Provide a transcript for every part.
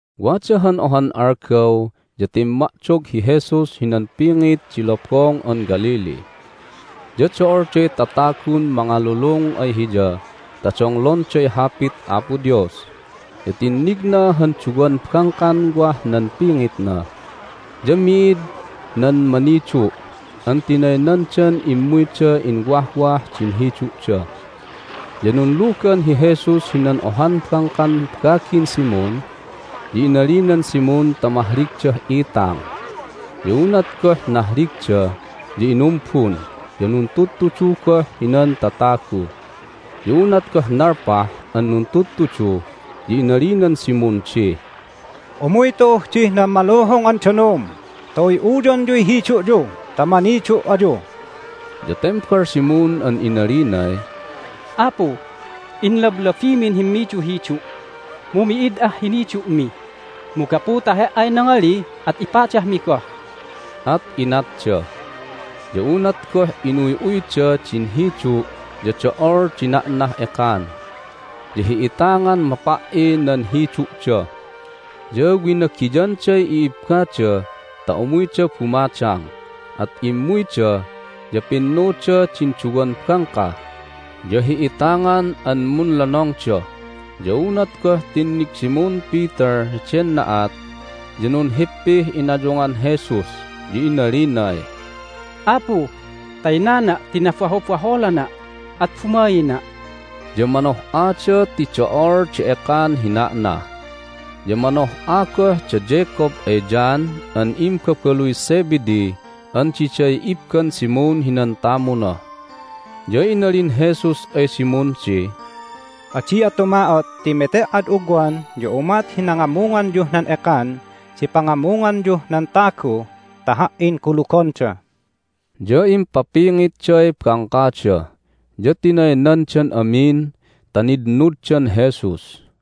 Wada han ohan algaw ya timma'dog hi Jesus hinan pingit di Lobong an Galilee, ya do'olday tatagun mangalulung ay Hiya ta donglonday Hapit Apo Dios. Ya tinnigna han duwan bangkan wah nan pingitna, ya mi'id nan manidu' an tinaynandan immuyda inwahwah din hidu'da. Ya nunlugan hi Jesus hinan ohan bangkan bagin Simon, ya inalinan Simon ta mahligdah itang. Ya unat goh nahligda ya inumbun, ya nuntudtudu goh hinan tatagu. Ya unat goh nalpah an nuntudtudu ya inalinan Simon di, "Umuy tu'uh dih nan maluhung an danum ta uy'uyonyuy hidu'yu ta manidu' ayu." Ya tembal Simon an inalinay, "Apu, inlablabimin himmiduhidu', mu mi'id ah hinidu'mi! Mu gapu ta He"ay nangali at ipadahmi goh." At inatda, ya unat goh inuy'uyda din hidu' ya do'ol di na'nah ekan, ya hi'itangan mapa"i nan hidu'da! Ya winagiyanday i'ibbada ta umuyda bumadang. At immuyda, ya pinnuda din duwan bangka, ya hi'itangan an munlonongda. Ya unat goh tinnig Simon Peter heden na'at ya nunhippih inayungan Jesus, ya inalinay, "Apu, taynana' ti nabahobaholana', at bumaina'!" Ya manoh'ada ti do'ol di ekan hi na'na, ya manoh'a goh da Jacob ay John an imbabaluy Zebedee an diday ibban Simon hinan tamuna. Ya inalin Jesus ay Simon di, "Adi'a tuma'ot ti mete"ad ugwan ya umat hi nangamunganyuh nan ekan di pangamunganyuh nan tagu ta Ha"in kulugonda." Ya impapingitday bangkada, ya tinaynandan amin ta nitnuddan Jesus.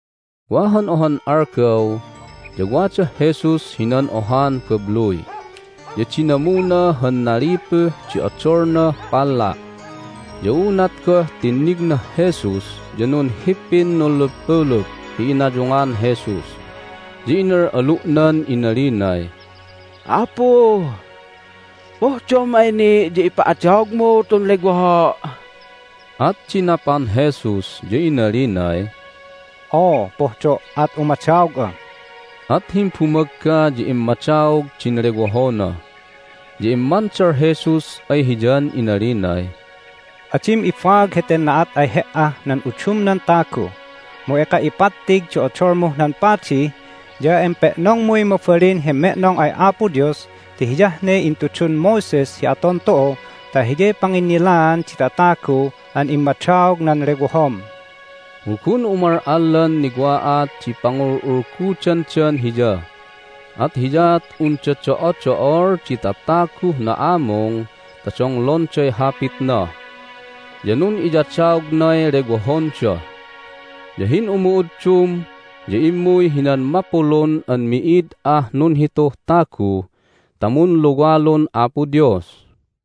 Wa han ohan algaw ya wadah Jesus hinan ohan babluy. Ya dinamuna han nalipuh di odolnah palla'. Ya unat goh tinnignah Jesus ya nunhippin nunluppulup hi inayungan Jesus, ya inal'alu'nan inalinay, "Apu, pohdom ay ni' ya ipa'adaogmu tun lewoho'!" At dinapan Jesus, ya inalinay, "Oo, pohdo', at umadaog'a!" At himbumagga ya immadaog din lewohona. Ya immandal Jesus ay hiyan inalinay, "Adim ibaag heten na'at ay he"ah nan udumnan tagu, mu eka ipattig di odolmuh nan padi, ya empe'nongmuy mabalin hi me'nong ay Apo Dios ti hiyah ne intudun Moses hi aton tu'u ta hiyay panginnilaan di tatagu an immadaog nan lewohom." Mu gun umal'allan niwa'at di pangul'ulgudandan Hiya, at hiyaat unda do'odo'ol di tataguh na'amung ta donglonday hapitna, ya nun'iyadaognay lewohonda. Ya hin'umu'uddum ya immuy hinan mapulun an mi'id ah nunhituh tagu ta munluwalun Apo Dios.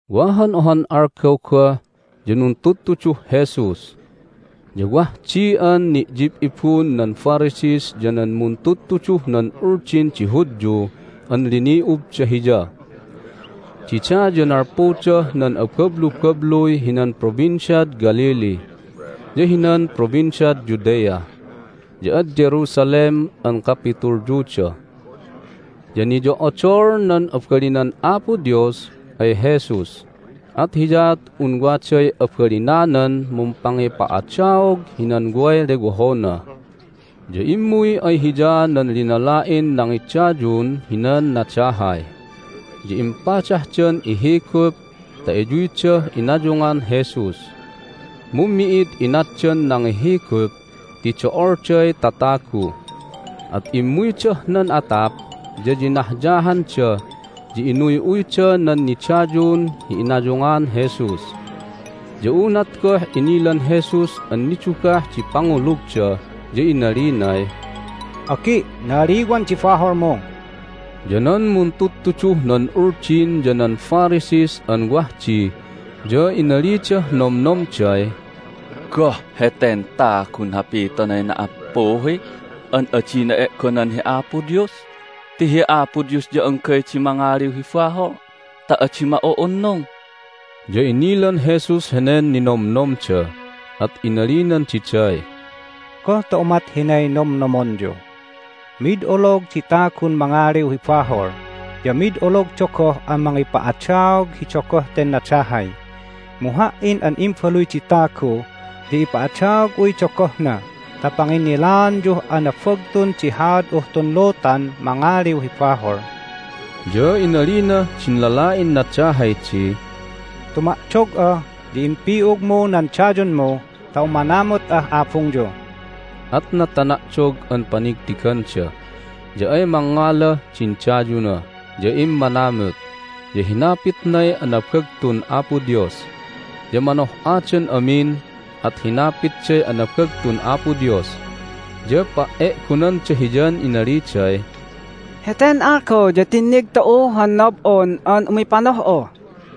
Wa han ohan algaw goh ya nuntudtuduh Jesus. Ya wah di an ni'yib'ibun nan Pharisees ya nan muntudtuduh nan Uldin di Hudyun an lini'ubda Hiya. Dida ya nalpudah nan abablubabluy hinan Provinciad Galilee, ya hinan Provinciad Judea, ya ad Jerusalem an kapitulyuda. Ya niyo'odol nan abalinan Apo Dios ay Jesus, at hiyaat un waday abalinanan mumpangipa'adaog hinan way lewohona. Ya immuy ay Hiya nan linala'in nangidayun hinan nadahay. Ya impadahdan ihigup ta iyuydah inayungan Jesus. Mu mi'id inatdan nangihigup ti do'olday tatagu. At immuydah nan atap, ya yinahyahanda, ya inuy'uyda nan nidayun hi inayungan Jesus. Ya unat goh inilan Jesus an nidugah di pangulugda ya inalinay, "Agi', na'aliwan di baholmu." Ya nan muntudtuduh nan Uldin ya nan Pharisees an wah di ya inalidah nomnomday, "Goh heten tagun hapitonay na"appuhi an adina e'gonan hi Apo Dios ti hi Apo Dios ya anggay di mangaliw hi bahol ta adi ma'u'unnung!" Ya inilan Jesus henen ninomnomda, at inalinan diday, "Goh ta umat hinay nomnomonyu? Mid olog di tagun mangaliw hi bahol, ya mid ologda goh an mangipa'adaog hi dogoh ten nadahay. Mu Ha"in an Imbaluy di Tagu ya ipa'adaog'uy dogohna ta panginnilaanyuh anabagtun di haad'uh tun lutan mangaliw hi bahol." Ya inalinah din lala'in nadahay di, "Tuma'dog'a, ya impi'ugmu nan dayunmu ta umanamut'ah abungyu." At natana'dog an panigtiganda, ya ay mangngalah din dayuna, ya immanamut, ya hinapitnay anabagtun Apo Dios. Ya manoh'adan amin, at hinapitday anabagtun Apo Dios, ya pa"e'gonanda Hiyan inaliday, "Heten algaw ya tinnig tu'u han nob'on an umipanoh'a!"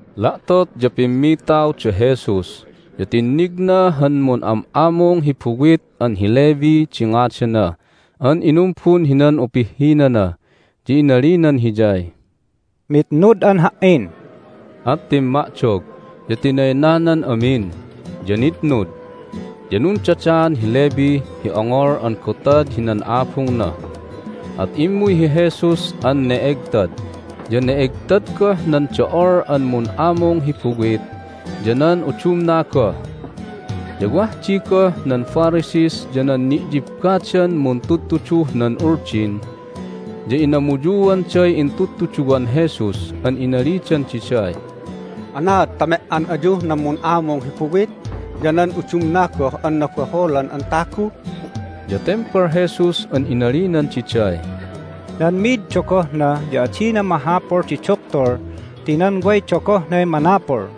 La'tot ya pimmitaw da Jesus, ya tinnigna han mun'am'amung hi buwit an hi Levi di ngadana an inumbun hinan upihhinana. Ya inalinan hiyay, "Mitnud'an Ha"in." At timma'dog, ya tinaynanan amin, ya nitnud. Ya nundadaan hi Levi hi ongol an gotad hinan abungna, at immuy hi Jesus an ne'egtad, ya ne'egtad goh nan do'ol an mun'amung hi buwit ya nan udumna goh. Ya wah di goh nan Pharisees ya nan ni'yibbadan muntudtuduh nan Uldin, ya inamuyuanday intudtuduwan Jesus an inalidan diday, "Anaad ta me"an ayuh nan mun'amung hi buwit ya nan udumna goh an nabaholan an tagu?" Ya tembal Jesus an inalinan diday, "Nan mi'id dogohna ya adina mahapul di duktul ti nan way dogohnay manapul.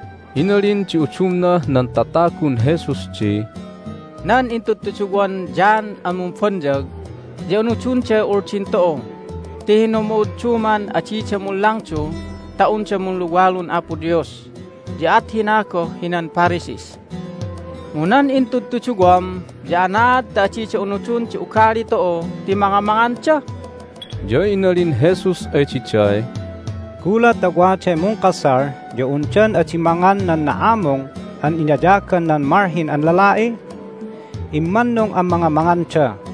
Inalin di udumnah nan tatagun Jesus di, "Nan intudtuduwan John an Mumbonyag ya unudonday Uldin tu'u ti hin'umu'udduman adida munlangdu ta unda munluwalun Apo Dios, ya at hina goh hinan Pharisees. Mu nan intudtuduwam ya anaad ta adida unudon di ugali tu'u ti mangamanganda?" Ya inalin Jesus ay diday, "Gulat ta waday mungkasal ya undan adi mangan nan na'amung an inayagan nan malhin an lala'i? Immannung an mangamanganda.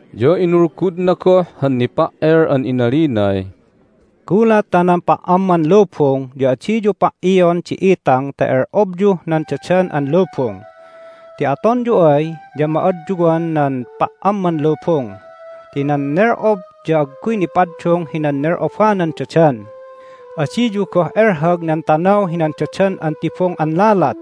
Ya inulgudna goh han nipa"el an inalinay, "Gulat ta nan pa"amman lubung ya adiyu pa"ion di itang ta el'obyuh nan dadan an lubung. Ti atonyu ay ya ma'adyuan nan pa"amman lubung. Ti nan nel'ob ya agguy nipaddung hinan nel'obanan dadan. Adiyu goh elhag nan tanaw hinan dadan an tibung an lalat.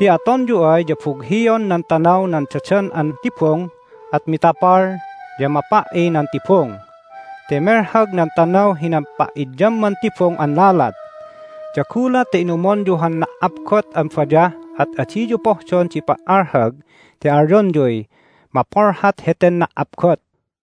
Ti atonyu ay ya bughion nan tanaw nan dadan an tibung, at mitapal, ya mapa"i nan tibung ti melhag nan tanaw hinan pa'idyamman tibung an lalat. Ya gulat ta inumonyu han na"apgot an bayah at adiyu pohdon di pa"alhag ti alyonyuy mapolhat heten na"apgot."